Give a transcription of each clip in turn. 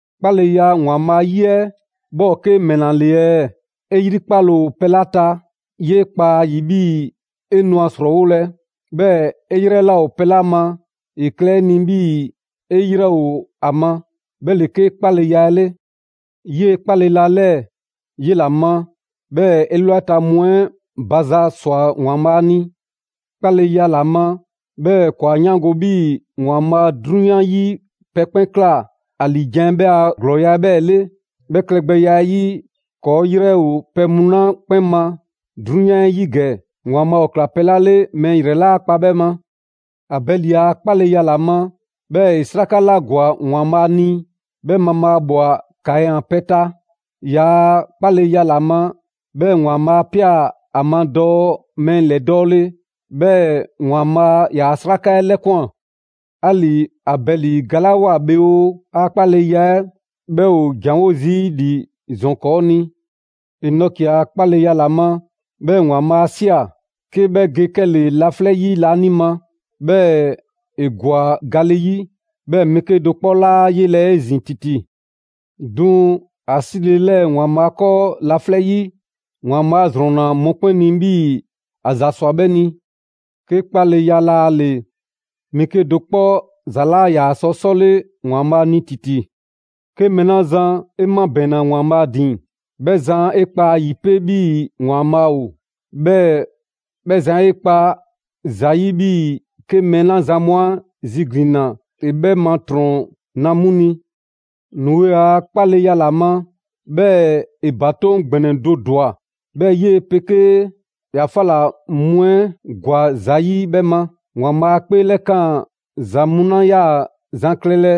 'Kpaleya ‑Waanbhaa' 'yi 'ɛ 'bhɛ ‑o 'ke ‑mɛla ‑le ɛɛ? 'E 'yrikpale ‑o pɛ 'la ta, 'yee kpa ‑a ‑yi 'bhii‑ 'e nu ‑a 'srɔɔwolɛ, 'bhɛɛ‑ 'e 'yrɛ 'laa ‑o pɛ 'la ma, ‑e klɛ 'e ni 'bhii‑ 'e 'yrɛ ‑o ‑a ma; 'bhɛ ‑le 'ke 'kpaleya 'ɛ 'le. 'Yee‑ 'kpaleya 'lɛɛ‑ 'yela‑ ma, 'bhɛɛ‑ 'elwaleta mu 'ɛ ba za ꞊swa ‑Waanbhaa' ni. 'Kpaleya ‑la ma, 'bhɛɛ‑ ‑kɔɔ' 'a 'yaango‑ 'bhii‑ ‑Waanbhaa' 'drunyan 'yi pɛ 'kpɛn ꞊kla ‑a ‑liijan' 'ɛ 'bhɛ a ‑glɔɔya' 'bhɛɛ‑ 'le. 'Bhɛ klɛgbɛya 'ɛ 'yi, ‑kɔɔ' 'yrɛ ‑o pɛ mu 'la 'kpɛn ma 'drunyan 'ɛ 'yi ‑gɛ, ‑Waanbhaa' ‑o ꞊kla pɛ 'la 'le mɛɛ ‑yrɛ 'laa kpa 'bhɛ ma. Abɛli a 'kpaleya ‑la ma, 'bhɛɛ‑ ‑e 'sraka 'la ‑gwa ‑Waanbhaa' ni, 'bhɛ mabhaabwa Kaɛn a pɛ 'ɛ ta. ‑Yaa' 'kpaleya ‑la ma, 'bhɛɛ‑ ‑Waanbhaa' 'a ꞊pia ‑a ma dɔɔ mɛɛ ‑lɛdɔɔle, 'bhɛɛ‑ ‑Waanbhaa' ‑yaa' 'sraka 'ɛ 'lɛkwan꞊. 'Ali‑ Abɛli galawoa bhe oo, ‑a 'kpaleya 'ɛ 'bhɛ ‑o ‑janwo' zii' ‑li ‑zɔn 'kɔɔ‑ ni. Enɔki a 'kpaleya ‑la ma, 'bhɛɛ‑ ‑Waanbhaa' 'a ꞊sia, 'ke 'bhɛ ge 'kɛle‑ laflɛ' 'yi laanima, 'bhɛɛ‑ ‑e ‑gwa gale 'yi. 'Bhɛɛ‑ mɛɛ 'kedo‑ 'kpɔ 'laa ‑a 'yelɛ‑ 'ezin‑ ‑titi. 'Duŋ‑ ‑a 'sile‑ ‑lɛɛ ‑Waanbhaa' 'kɔɔ laflɛ' 'yi, ‑Waanbhaa' 'a ‑zrɔnna mɔkpɛn' ni 'bhii‑ ‑a ‑za ꞊swa 'bhɛ ni. 'Ke 'kpaleya laa ‑le, mɛɛ 'kedo‑ 'kpɔ ‑za 'laa ‑yaa sɔ 'sɔle ‑Waanbhaa' ni ‑titi. 'Ke mɛɛ 'la zan 'e 'mabɛɛnna ‑Waanbhaa' ‑din, 'bhɛ zan 'e 'kpa ‑a ‑yi 'pe 'bhii‑ ‑Waanbhaa' ‑o, 'bhɛɛ‑ 'bhɛ zan 'e 'kpa ‑za 'yi 'bhii‑ 'ke mɛɛ 'la zan mu ‑a ziglinna ‑e 'bhɛ ma ‑trɔn na 'mu ni. Noe a 'kpaleya ‑la ma, 'bhɛɛ‑ ‑e ‑batoŋ' ‑gbɛnɛ do ‑dwa, 'bhɛɛ‑ 'yee‑ 'pegee ‑yaa' 'fa ꞊la mu 'ɛ ‑gwa ‑za 'yi 'bhɛ ma. ‑Waanbhaa' 'a 'kpeelɛkaan ‑za mu 'la 'yaa‑ zan klɛlɛ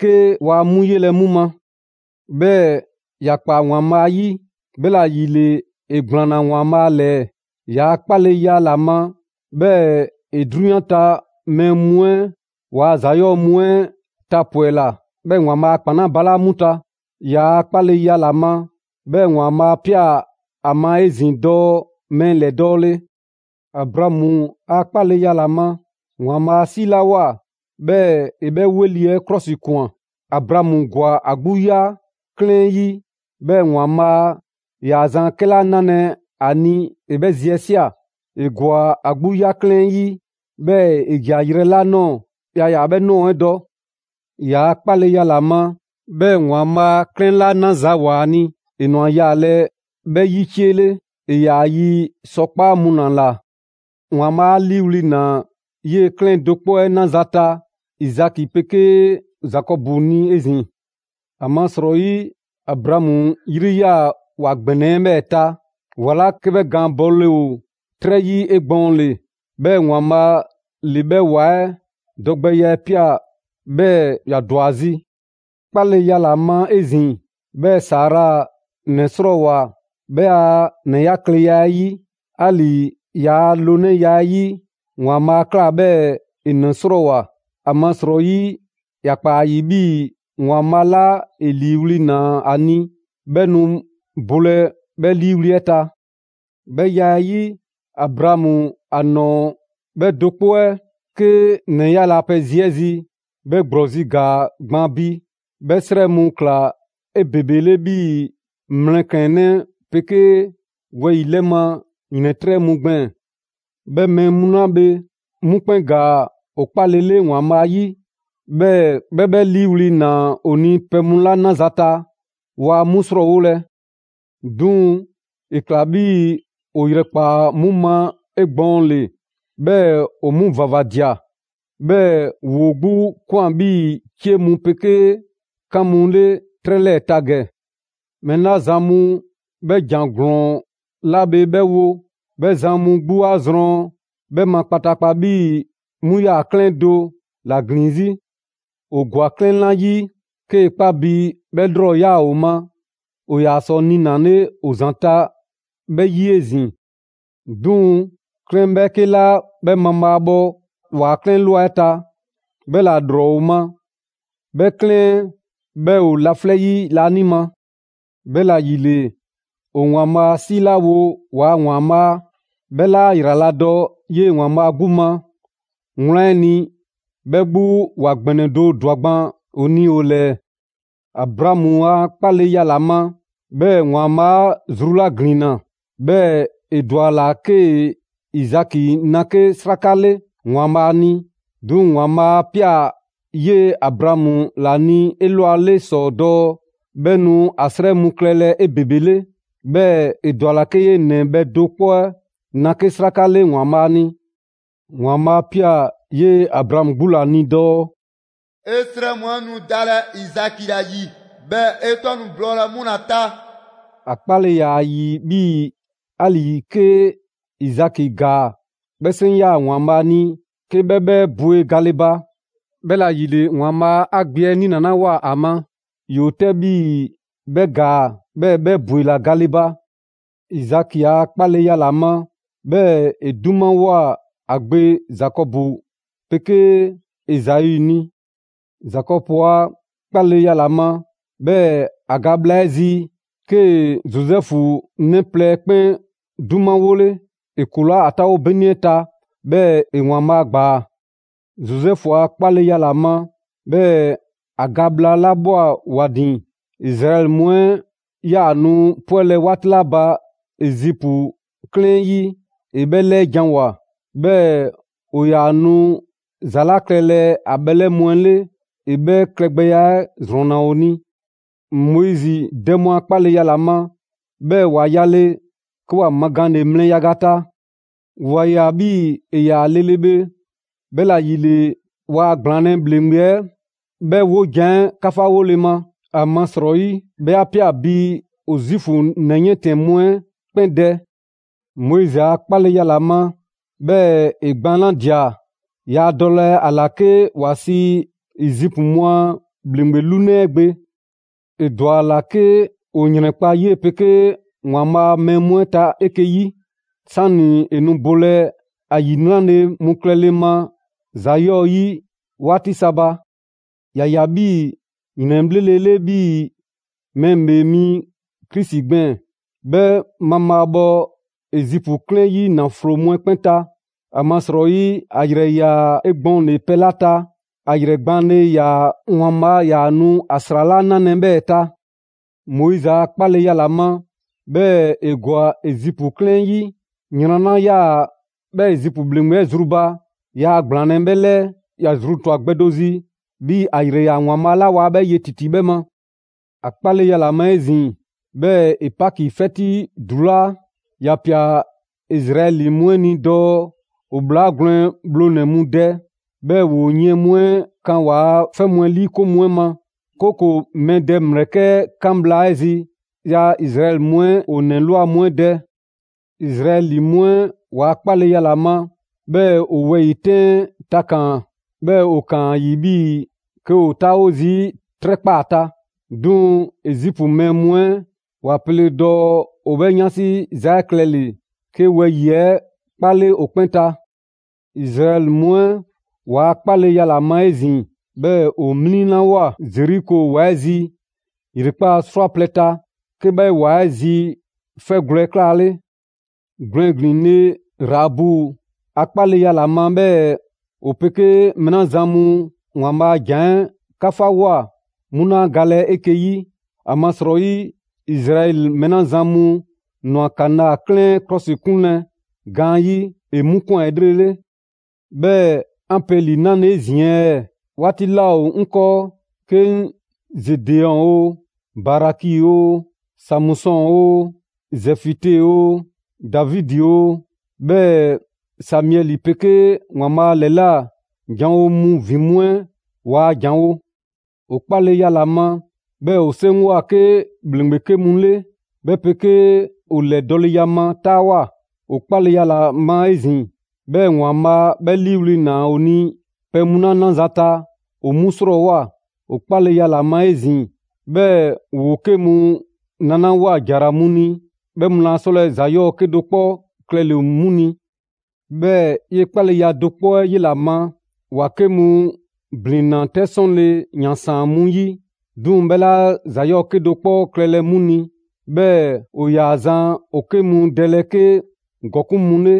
'ke waa 'mu 'yelɛ‑ 'mu ma; 'bhɛɛ‑ ‑ya ꞊kpaa ‑Waanbhaa' ‑yi. 'Bhɛla‑ ‑yile ‑e ‑gblaanna ‑Waanbhaa' ‑lɛɛ. ‑Yaa' 'kpaleya ‑la ma, 'bhɛɛ‑ ‑e 'drunyan ta mɛɛ mu 'ɛ ‑waa' ‑za 'yɔɔ‑ mu 'ɛ tapwɛla, 'bhɛɛ‑ ‑e ‑Waanbhaa' a ‑kpan ‑balaa' 'mu ta. ‑Yaa' 'kpaleya ‑la ma, 'bhɛɛ‑ ‑Waanbhaa' 'a ꞊pia ‑a ma 'ezin‑ dɔɔ mɛɛ ‑lɛdɔɔle. Abraamu a 'kpaleya ma, ‑Waanbhaa' 'a 'siilawoa 'bhɛɛ‑ ‑e 'bhɛ 'weli‑ 'ɛ 'klɔsikwan. Abraamu ‑gwa ‑a 'gbu 'ya 'klɛɛn 'ɛ 'yi, 'bhɛɛ‑ ‑Waanbhaa' ‑yaa zan 'kɛla 'nalɛ‑ ‑a ni ‑e 'bhɛ zi 'ɛ ꞊sia. ‑E ‑gwa ‑a 'gbu 'ya 'klɛɛn 'ɛ 'yi, 'bhɛɛ‑ ‑e ‑ja yrɛ 'la ꞊nɔɔ, yaa ‑yaa 'bhɛ ꞊nɔɔ 'ɛ dɔ. ‑Yaa' 'kpaleya ‑la ma, 'bhɛɛ‑ ‑Waanbhaa' 'klɛɛn 'la 'naza‑ ‑woa ‑a ni, ‑e ꞊nwa yaalɛ 'bhɛ 'yi 'cie 'le. ‑E ‑yaa yi sɔkpaa' mu ‑la ꞊la. ‑Waanbhaa' 'a 'liiwli‑ ꞊naa 'yee‑ 'klɛɛn do 'kpɔ 'ɛ 'naza‑ ta Izaki 'pegee Zakɔbu ni 'ezin‑. ‑Amasrɔyi Abraamu 'yri 'yaa‑ ‑wa ‑gbɛnɛ 'ɛ 'bhɛɛ‑ ta, ‑wa 'la 'ke 'bhɛ gaan bɔle ‑o 'trɛ 'yi 'egbɔɔnle. 'Bhɛɛ‑ ‑Waanbhaa' ‑le 'bhɛ ‑wa 'ɛ dɔgbɛya 'ɛ ꞊pia 'bhɛɛ‑ ‑ya ‑dwa zi. 'Kpaleya ‑la ma 'ezin‑, 'bhɛɛ‑ Sara ‑nɛ 'srɔɔwoa‑ 'bhɛ a ‑nɛyakleya 'ɛ 'yi. 'Ali‑ ‑yaa' loonɛya 'ɛ 'yi, ‑Waanbhaa' 'a ꞊kla 'bhɛɛ‑ ‑e ‑nɛ 'srɔɔwoa‑. ‑Amasrɔyi ‑ya ꞊kpaa ‑a ‑yi 'bhii‑ ‑Waanbhaa' 'la 'e 'liiwli‑ ꞊naa ‑a ni 'bhɛ nu bolɛ 'bhɛ 'liiwli‑ 'ɛ ta. 'Bhɛ ya 'ɛ 'yi, Abraamu, ‑a nɔɔ‑ bhɛ do 'kpɔ 'ɛ, 'ke ‑nɛyale a pɛ zi 'ɛ zi, 'bhɛ ‑gblɔzi' ‑gaa gban bi, 'bhɛ 'srɛ mu ꞊kla 'ebebele 'bhii‑ mlɛklɛnnɛ 'pegee wɛyi‑ 'lɛ ma ‑yrɛntrɛ' mu gbɛɛn‑. 'Bhɛ mɛɛ mu la bhe, 'mu 'kpɛn ‑gaa ‑o 'kpalele ‑Waanbhaa' 'yi, 'bhɛɛ‑ 'bhɛ 'bhɛ 'liiwli‑ ‑naa ‑o ni pɛ mu 'la 'naza‑ ta, waa 'mu ‑srɔɔwolɛ. 'Duŋ‑ ‑e ꞊kla 'bhii‑ ‑o ‑yrɛkpaa 'mu ma 'egbɔɔnle, 'bhɛɛ‑ ‑o 'mu ‑vavadia. 'Bhɛɛ‑ ‑woo 'gbu ꞊kwan 'bhii‑ 'cie mu 'pegee 'kan mu 'le 'trɛ 'lɛɛ‑ ta ‑gɛ. Mɛɛ 'la zan mu 'bhɛ ‑jan ‑glɔɔn 'la bhe 'bhɛ wo, 'bhɛ zan mu 'gbu 'a zrɔn 'bhɛ ma kpataakpa 'bhii‑ 'mu 'yaa‑ 'klɛɛn do ‑la ‑glin 'zi. ‑O ‑gwa 'klɛɛn 'la 'yi, 'kee‑ 'kpa bi 'bhɛɛ‑ ‑lrɔ ‑yaa ‑o ma, ‑o ‑yaa sɔ niinale ‑o ‑zanta' 'bhɛ 'yi 'ezin‑. 'Duŋ‑ 'klɛɛn 'bhɛɛke 'la 'bhɛ mabhaabhɔ ‑waa' 'klɛɛn ꞊lwa 'ɛ ta, 'bhɛ ‑la ‑lrɔ ‑o ma; 'bhɛ 'klɛɛn 'ɛ 'bhɛ ‑o laflɛ' 'yi laanima. 'Bhɛla‑ ‑yile, ‑o ‑Waanbhaa' 'siilawo ‑waa' ‑Waanbhaa', 'bhɛ 'laa ‑yraladɔ 'yee‑ ‑Waanbhaa' 'gbu ma; wlan 'ɛ ni, 'bhɛ 'gbu ‑wa ‑gbɛnɛ do ‑dwa gban ‑o ni ‑o ‑lɛɛ. Abraamu a 'kpaleya ‑la ma, 'bhɛɛ‑ ‑Waanbhaa' 'a zru 'la ‑glinna, 'bhɛɛ‑ ‑e ‑dwa ‑a ‑la 'kee‑ Izaki na 'ke 'sraka 'le ‑Waanbhaa' ni. 'Duŋ‑ ‑Waanbhaa' 'a ꞊pia 'yee‑ Abraamu ‑la ni 'elwale ‑sɔ dɔɔ 'bhɛ nu ‑a 'srɛ mu klɛlɛ 'ebebele. 'Bhɛɛ‑ ‑e ‑dwa ‑a ‑la 'kee‑ 'yee‑ ‑nɛ bhɛ do 'kpɔ 'ɛ na 'ke 'sraka 'le ‑Waanbhaa' ni. ‑Waanbhaa' 'a ꞊pia 'yee‑ Abraamu 'gbu ‑la ni dɔɔ: «'E 'srɛ mu 'ɛ nu dalɛ Izaki ‑la ‑yi, 'bhɛɛ‑ 'e 'tɔ nu blɔɔlɛ 'mu ‑la ta.» ‑A 'kpale‑ ‑yaa ‑a ‑yi 'bhii‑ 'ali‑ 'ke Izaki ‑gaa, 'bhɛ 'seŋ 'yaa‑ ‑Waanbhaa' ni 'ke 'bhɛ 'bhɛ bwe gale ba. 'Bhɛla‑ ‑yile, ‑Waanbhaa' 'a gbe 'ɛ 'niinalawoa ‑a ma, ‑yoo 'tɛ 'bhii‑ 'bhɛ ‑gaa, 'bhɛɛ‑ 'bhɛ ‑bwela gale ba. Izaki a 'kpaleya ‑la ma, 'bhɛɛ‑ ‑e 'dumawoa ‑a gbe Zakɔbu 'pegee Ezau ni. Zakɔbu a 'kpaleya ‑la ma, 'bhɛɛ‑ ‑a ga bhla 'ɛ zi, 'kee‑ Zozɛfu 'nɛ plɛ 'ɛ 'kpɛn 'dumawole. ‑E ‑kulaa' ‑a 'taawo 'beni 'ɛ ta 'bhɛɛ‑ ‑e ‑Waanbhaa' ‑gbaa. Zozɛfu a 'kpaleya ‑la ma, 'bhɛɛ‑ ‑a ga bhla 'la ꞊bhwa ‑wa ‑din, Izraɛli mu 'ɛ 'yaa‑ nu 'pwɛlɛ‑ 'waati 'la ba Ezipu 'klɛɛn 'ɛ 'yi, ‑e 'bhɛ 'lɛɛjanwoa. 'Bhɛɛ‑ ‑o ‑yaa nu ‑za 'la klɛlɛ ‑a bhɛlɛ' mu 'ɛ 'le ‑e 'bhɛ klɛgbɛya 'ɛ ‑zrɔnna ‑o ni. Moizi dɛ mu a 'kpaleya ‑la ma, 'bhɛɛ‑ ‑wa yale, 'ke ‑wa magaanle mlɛ yaga ta. ‑Wa ꞊ya 'bhii‑ ‑e ‑yaa lele bhe, 'bhɛla‑ ‑yile waa ‑gblaanlɛ' ‑bhleŋgbe 'ɛ 'bhɛ 'wojan‑ 'ɛ 'kafawole ma (‑amasrɔyi 'bhɛ 'a ꞊pia bi ‑o Zuufu 'nɛ 'yiɛntɛnnɛ mu 'ɛ 'kpɛn dɛ). Moizi a 'kpaleya ‑la ma, 'bhɛɛ‑ ‑e gbaanladia, yaa dɔlɛ ‑a ‑la 'ke ‑wa sii Ezipu mu a ‑bhleŋgbe 'lunɛ 'ɛ gbe. ‑E ‑dwa ‑a ‑la 'ke ‑o ‑yrɛnkpa' 'yee‑ 'pegee ‑Waanbhaa' a mɛɛ mu 'ɛ ta 'eke‑ 'yi, 'sani‑ ‑e nu bolɛ ‑a ‑yinraza mu klɛle ma ‑za 'yɔɔ‑ 'yi 'waati sa ba. ‑Ya ꞊ya 'bhii‑ ‑yrɛnbhlele 'bhii‑ Mɛɛ ‑Bhee Mi Krisi gbɛɛn‑, 'bhɛ mabhaabhɔ Ezipu 'klɛɛn 'yi ‑naflo mu 'ɛ 'kpɛn ta. ‑Amasrɔyi ‑a ‑yrɛ ‑yaa 'egbɔɔnle pɛ ‑la ta, ‑a ‑yrɛ gbaanle ‑yaa ‑Waanbhaa' ‑yaa nu ‑a ‑sra 'la 'nalɛ‑ 'bhɛɛ‑ ta. Moizi a 'kpaleya ‑la ma, 'bhɛɛ‑ ‑e ‑gwa Ezipu 'klɛɛn 'ɛ 'yi. Yran 'la 'yaa‑ 'bhɛ Ezipu ‑bhleŋgbe 'ɛ zru ba, yaa gblaanlɛ 'bhɛ 'lɛɛ. ‑Ya zru ꞊twa gbɛ do zi, 'bhii‑ ‑a ‑yrɛ ‑yaa ‑Waanbhaa' 'la waa 'bhɛ ye ‑titi 'bhɛ ma. ‑A 'kpaleya ‑la ma 'ezin‑, 'bhɛɛ‑ ‑e Paki 'fɛti ‑dulaa'. ‑Ya ꞊pia Izraɛli mu 'ɛ ni dɔɔ ‑o ‑bhlaa gwlɛn bhlonɛ‑ mu dɛ, 'bhɛɛ‑ ‑woo yiɛn mu 'ɛ kan ‑waa' 'fɛ mu 'ɛ 'liikoŋ mu 'ɛ ma; 'kooko‑ mɛɛ dɛ ‑mlɛkɛ' 'ɛ 'kan bhla 'ɛ zi, yaa Izraɛli mu 'ɛ ‑o ‑nɛ ꞊lwa mu 'ɛ dɛ. Izraɛli mu 'ɛ ‑waa' 'kpaleya ‑la ma, 'bhɛɛ‑ ‑o wɛyi‑ 'tɛn 'ɛ takaan‑, 'bhɛɛ‑ ‑o ‑kaan ‑a ‑yi 'bhii‑ 'ke ‑o 'taawo zii' 'trɛ ꞊kpaa ta. 'Duŋ‑ Ezipu mɛɛ mu 'ɛ ‑wa pele dɔɔ ‑o 'bhɛ 'yansi za 'ɛ klɛle‑ 'ke wɛyi‑ 'ɛ 'kpale ‑o 'kpɛn ta. Izraɛli mu 'ɛ ‑waa' 'kpaleya ‑la ma 'ezin‑, 'bhɛɛ‑ ‑o 'mliŋlawoa Zeriko ‑wa 'ɛ zi ‑yrekpaa' 'srwaplɛ‑ ta, 'ke 'bhɛ ‑wa 'ɛ zi 'fɛgwlɛ‑ 'ɛ 'klaale. Gwlɛn ‑glin le Raabu a 'kpaleya ‑la ma, 'bhɛɛ‑ ‑o 'pegee mɛɛ 'la zan mu ‑Waanbhaa' a ‑jan 'ɛ 'kafawoa 'mu 'laa galɛ 'eke‑ 'yi. ‑Amasrɔyi Izraɛli mɛɛ 'la zan mu ‑nwa Kanaa 'klɛɛn 'ɛ 'klɔsikunlɛ gaanyi', ‑e 'mu ꞊kwan 'elrele. 'Bhɛɛ‑ 'an pe ‑li 'nale‑ 'ezin‑ ɛɛ? 'Waati 'laa ‑o 'ŋ 'kɔɔ 'ke 'ŋ Zedeɔn oo, Baraki oo, Samusɔn oo, Zɛfite oo, Davidi oo, 'bhɛɛ‑ Samiɛli 'pegee ‑Waanbhaa' ‑lɛla' janwo mu ‑vin mu 'ɛ waa ‑janwo'. ‑O 'kpaleya ‑la ma, 'bhɛɛ‑ ‑o 'seŋgwa‑ 'ke ‑bhleŋgbe 'ke mu 'le, 'bhɛ 'pegee ‑o ‑lɛdɔɔleya ma 'taawoa꞊. ‑O 'kpaleya ‑la ma 'ezin‑, 'bhɛɛ‑ ‑Waanbhaa' 'bhɛ 'liiwli‑ ‑naa ‑o ni pɛ mu 'la 'naza‑ ta, ‑o 'mu ‑srɔɔwoa. ‑O 'kpaleya ‑la ma 'ezin‑, 'bhɛɛ‑ ‑woo 'ke mu nalawoa ‑jara mu ni, 'bhɛɛ‑ 'mu laa 'sɔlɛ‑ ‑za 'yɔɔ‑ 'kedo‑ 'kpɔ klɛle‑ 'mu ni. 'Bhɛɛ‑ 'yee‑ 'kpaleya do 'kpɔ 'ɛ 'yela‑ ma, ‑wa 'ke mu ‑blinna 'tɛ 'lɛsɔnle ‑yansaan mu 'yi, 'duŋ‑ 'bhɛ 'laa ‑za 'yɔɔ‑ 'kedo‑ 'kpɔ klɛlɛ 'mu ni. 'Bhɛɛ‑ ‑o ‑yaa zan ‑o 'ke mu dɛlɛ 'ke ‑gɔkuŋ' mu 'le,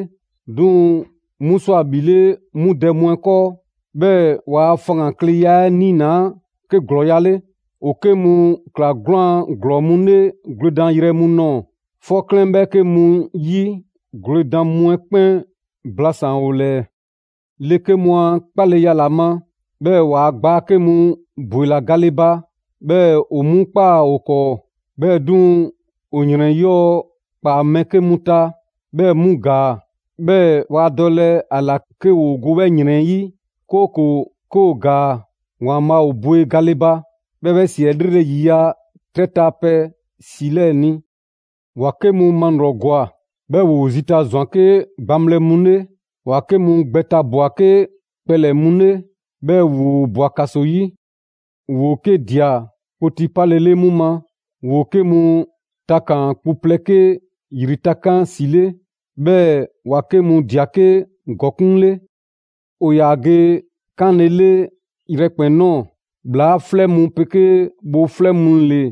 'duŋ‑ 'mu ‑swa ‑bhile' 'mu dɛ mu 'ɛ 'kɔɔ. 'Bhɛɛ‑ ‑waa' faŋgankleya 'ɛ 'niinaa 'ke ‑glɔɔya' 'le. ‑O 'ke mu ꞊kla 'gwlaan‑ ‑glɔɔ mu 'le gwledanyrɛ mu nɔɔ‑, 'fɔ 'klɛɛn 'bhɛɛke mu ‑yi gwledan mu 'ɛ 'kpɛn blasaan‑ ‑o ‑lɛɛ. Le 'ke mu a 'kpaleya ‑la ma, 'bhɛɛ‑ ‑waa' gbaa 'ke mu ‑bwela gale ba, 'bhɛɛ‑ ‑o 'mu ꞊kpaa ‑o 'kɔɔ. 'Bhɛɛ‑ 'duŋ‑ ‑o ‑yrɛn 'yɔɔ‑ ‑kpaa mɛɛ 'ke mu ta 'bhɛɛ‑ 'mu ‑gaa; 'bhɛɛ‑ waa dɔlɛ ‑a ‑la 'ke ‑woo go 'bhɛ ‑yrɛn 'ɛ 'yi, 'kooko‑ 'ke ‑o ‑gaa ‑Waanbhaa' ‑o bwe gale ba; 'bhɛɛ‑ 'bhɛ ‑si 'ɛ 'lrele‑ ‑yiya' 'trɛ ta pɛ ‑si 'lɛɛ‑ ni. ‑Wa 'ke mu malrɔgwa, 'bhɛɛ‑ ‑woo zita ꞊zwan 'ke gbaŋbhlɛ mu 'le. ‑Wa 'ke mu gbɛ tabwa‑ 'ke kpɛlɛ‑ mu 'le, 'bhɛɛ‑ ‑woo ꞊bwa ‑kaso 'yi. ‑Woo 'ke ꞊dia kpoti 'palele 'mu ma. ‑Woo 'ke mu takaan‑ kpu plɛ 'ke ‑yri takan' ‑si 'le, 'bhɛɛ‑ ‑wa 'ke mu ꞊dia 'ke ‑gɔkuŋ' 'le. ‑O ‑yaa ge 'kaanlele yrɛkpɛn‑ ꞊nɔɔ, ‑bhlaa 'flɛ mu 'pegee bhoo 'flɛ mu 'le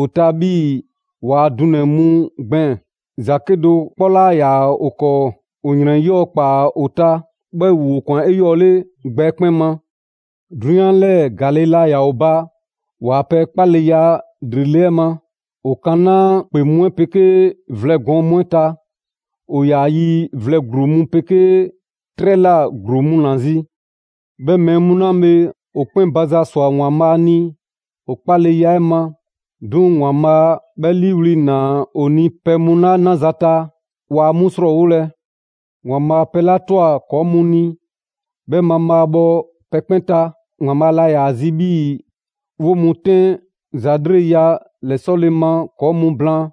‑o ta 'bhii‑ ‑waa' dunɛ‑ mu gbɛɛn‑. ‑Za 'kedo‑ 'kpɔ 'laa ‑yaa ‑o 'kɔɔ, ‑o ‑yrɛn 'yɔɔ‑ ‑kpaa ‑o ta, 'bhɛɛ‑ ‑woo ꞊kwan 'eyɔɔle gbɛ 'ɛ 'kpɛn ma. 'Drunyan 'lɛɛ‑ ‑gaale' laa ‑yaa ‑o ba ‑waa pɛ 'kpaleya ‑lrele' 'ɛ ma! ‑O ‑kanaa' ‑kpe mu 'ɛ 'pegee vlɛ gɔɔn mu 'ɛ ta; ‑o ‑yaa yi vlɛ ‑gluu mu 'pegee 'trɛ ꞊la ‑gluu mu ‑la zi. 'Bhɛ mɛɛ mu 'la bhe, ‑o 'kpɛn ba za ꞊swa ‑Waanbhaa' ni ‑o 'kpaleya 'ɛ ma; 'duŋ‑ ‑Waanbhaa' 'bhɛ 'liiwli‑ ‑naa ‑o ni pɛ mu 'la 'naza‑ ta, waa 'mu ‑srɔɔwolɛ. ‑Waanbhaa' pɛ 'la ꞊twa ‑kɔɔ' mu ni, 'bhɛ mabhaabhɔ pɛ 'kpɛn ta. ‑Waanbhaa' laa ‑yaa zi 'bhii‑ 'woo‑ mu 'tɛn ‑za 'lreleya ‑lɛsɔle 'ɛ ma ‑kɔɔ' mu blaan.